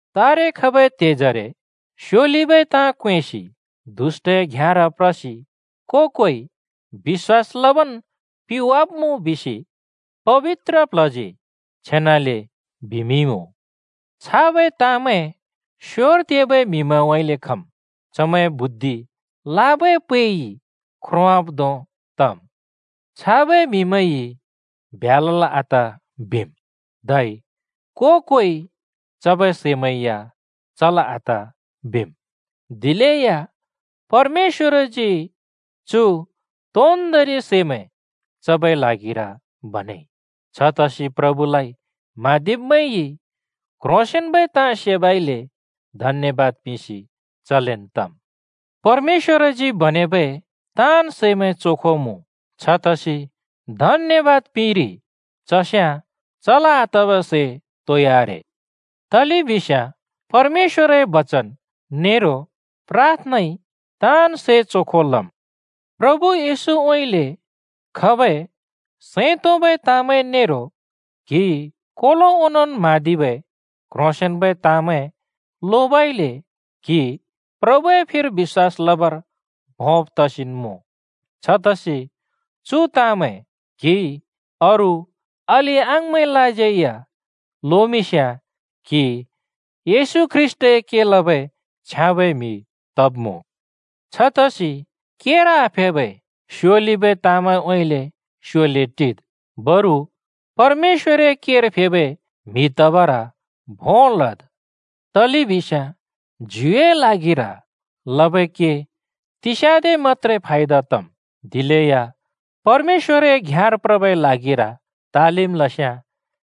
तारे खबै त्हेजरे स्योलिबै ताँ क्वेंसि दुष्‍टए घ्याँर प्रसि को-कोइ बिश्‍वास लबन् पिवाब्मुँ बिसि पबित्र प्ल्हजी छेनाले बिमिंइमुँ। छाबै ताँमैं स्‍योर तेबै म्हिमैंउँइँले खम्। चमैंए बुद्धि लाबै पैइ ख्रोंवाब् धों तम्। छाबै म्हिमैंइ ब्ह्‍या लल् आत बिम्, धै को-कोइ चबै सै या चल् आत बिम्। दिलेया परमेश्‍वरजी चु तोन्दोंरि सैमैं चबै ल्हागिर बनेइ। छतसि प्रभुलाइ म्हाँदिब्मैंइ क्ह्रोंसेंन्बै ताँ सेबइले धन्‍यबाद पिंसि चलेन् तम्। परमेश्‍वरजी बनेबै ताँन् सैमैं चोखो मुँ। छतसि धन्‍यबाद पिंइरि चस्याँ चल् आतबै सै तोइ आरे। तलेबिस्याँ परमेश्‍वरए बचन नेरो प्राथनाइ ताँन् सै चोखो लम्। प्रभु येशूउँइँले खबै सैं तोंबै ताँमैं नेरो क्हिइ कोलो ओंनोंन् म्हाँदिबै क्ह्रोंसेंन्बै ताँमैं लोबइले क्हि प्रभुए फिर बिश्‍वास लबर भोंब् तसिन्मुँ। छतसि चु ताँमैं क्हिइ अरू अलि-अङाँमैंलाज्यै या लोमिंस्याँ क्‍हि येशू ख्रीष्‍टए के लबै छ्याँबै म्‍हि तब्‍मुँ। छतसि केर आफेबै स्‍योलिबै ताँमैंउँइँले स्‍योले टिद्। बरु परमेश्‍वरए केर फेबै म्हि तबर भों लद्। तलेबिस्याँ ज्युए ल्हागिर लबै के तिस्याँदे मत्‍त्रे फायदा तम्। दिलेया परमेश्‍वरए घ्याँर प्रबै ल्हागिर तालिम लस्‍याँ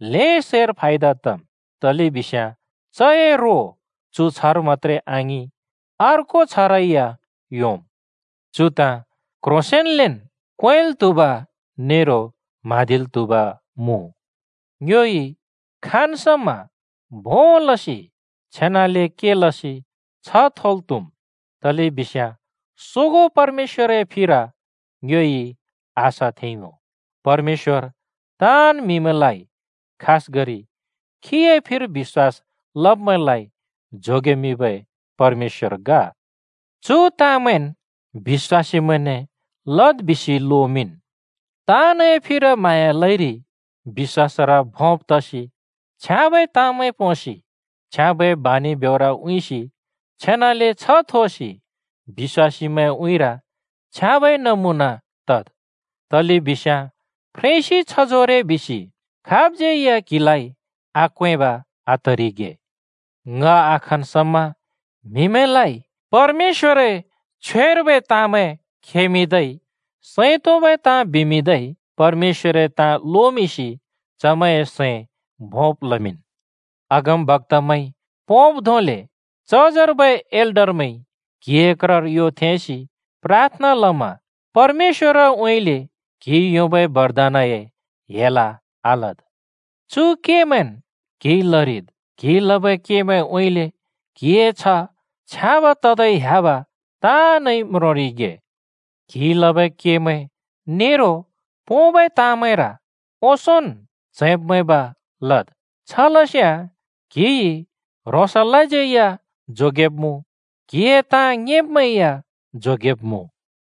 ल्हें सैर फायदा तम्, तलेबिस्याँ चए रो चु छ्हर मत्‍त्रे आङिं अर्को छ्हरै या योंम्। चु ताँ क्‍ह्रोंसेंन्लेन् क्वेंल् त्हुब नेरो म्हाँदिल् त्हुब मुँ: ङ्योइ खाँन् समा भों लसि छेनाले के लसि छ्ह थोल् त्हुम्, तलेबिस्याँ सोगों परमेश्‍वरए फिर ङ्योइ आशा थेंइमुँ। परमेश्‍वर ताँन् म्हिमैंलाइ, खासगरि खीए फिर बिश्‍वास लब्‍मैंलाइ जोगेमिंबै परमेश्‍वर ग। चु ताँमैंन् बिश्‍वासीमैंने लद् बिसि लोमिंन्। ताँनए फिर म्हाँया लइरि बिश्‍वासर भोंब् तसि, छ्याँबै ताँमैं पोंसि, छ्याँबै बानि ब्योर उँइँसि, छेनाले छ्ह थोसि बिश्‍वासीमैंए उँइँर छ्याँबै नमुना तद्। तलेबिस्याँ फ्रेंसि छजोरे बिसि खाबज्यै या क्हिलाइ आक्वेंब आतरिगे। ङ आखन् समा म्हिमैंलाइ परमेश्‍वरए छ्वेर्बै ताँमैं खेमिंदै, सैं तोंबै ताँ बिमिंदै परमेश्‍वरए ताँ लोमिंसि चमैंए सैं भोंब् लमिंन्। अगमबक्‍तामैंइ पोंब् धोंले चजर्बै एल्डरमैंइ क्हिए क्रर यो थेंसि प्राथना लमा परमेश्‍वरउँइँले क्हिइ योंबै बरदानए हेल आलद्। चु केमैंन् क्हिइ लरिद्। क्हिइ लबै केमैंउँइँले क्हिए छ्ह छ्याँब ततै ह्‍याब ताँनइ म्रोंरिगे। क्हिइ लबै केमैं नेरो पोंबै ताँमैंर ओंसोंन् च्हैंब् मैंब् लद्। छलस्याँ क्‍हिइ ह्रोंसलाज्यै या जोगेब्मुँ, क्‍हिए ताँ ङेंब्‍मैं या जोगेब्मुँ।